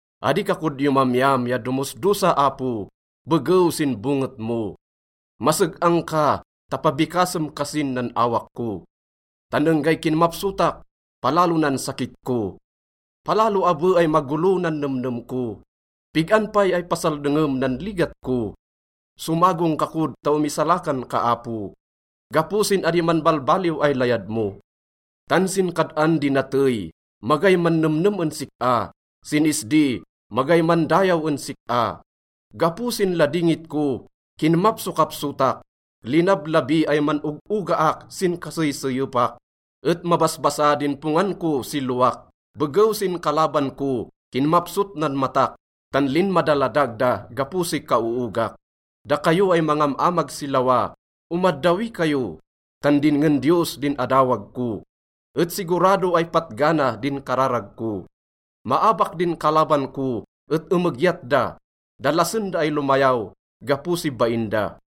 Adi ka kod yomamyam ya domosdosa, Apo, begew sin bonget mo. Maseg-ang ka ta pabikasem kasin nan awak ko, tan enggay kinmapsotak, palalo nan sakit ko. Palalo abe ay magolo nan nemnem ko. Pig-an pay ay pasaldengem nan ligat ko? Somagong ka kod ta omisalakan ka, Apo, gapo sin adi manbalbaliw ay layad mo. Tan sin kad-an di natey, magay mannemnem en sik-a, sin isdi magay mandayaw en sik-a. Gapo sin ladingit ko, kinmapsokapsotak. Linablabi ay man-og-ogaak sin kaseyseyepak, et mabasbasa din pongan ko si lowak. Begew sin kalaban ko, kinmapsot nan matak, tan linmadaladag da gapo si kaoogak. Dakayo ay mangam-amag si lawa, omaddawi kayo, tan dinngen Diyos din adawag ko, et sigurado ay patgana din kararag ko. Maabak din kalaban ko et emegyat da. Dalasen da ay lomayaw gapo si bain da.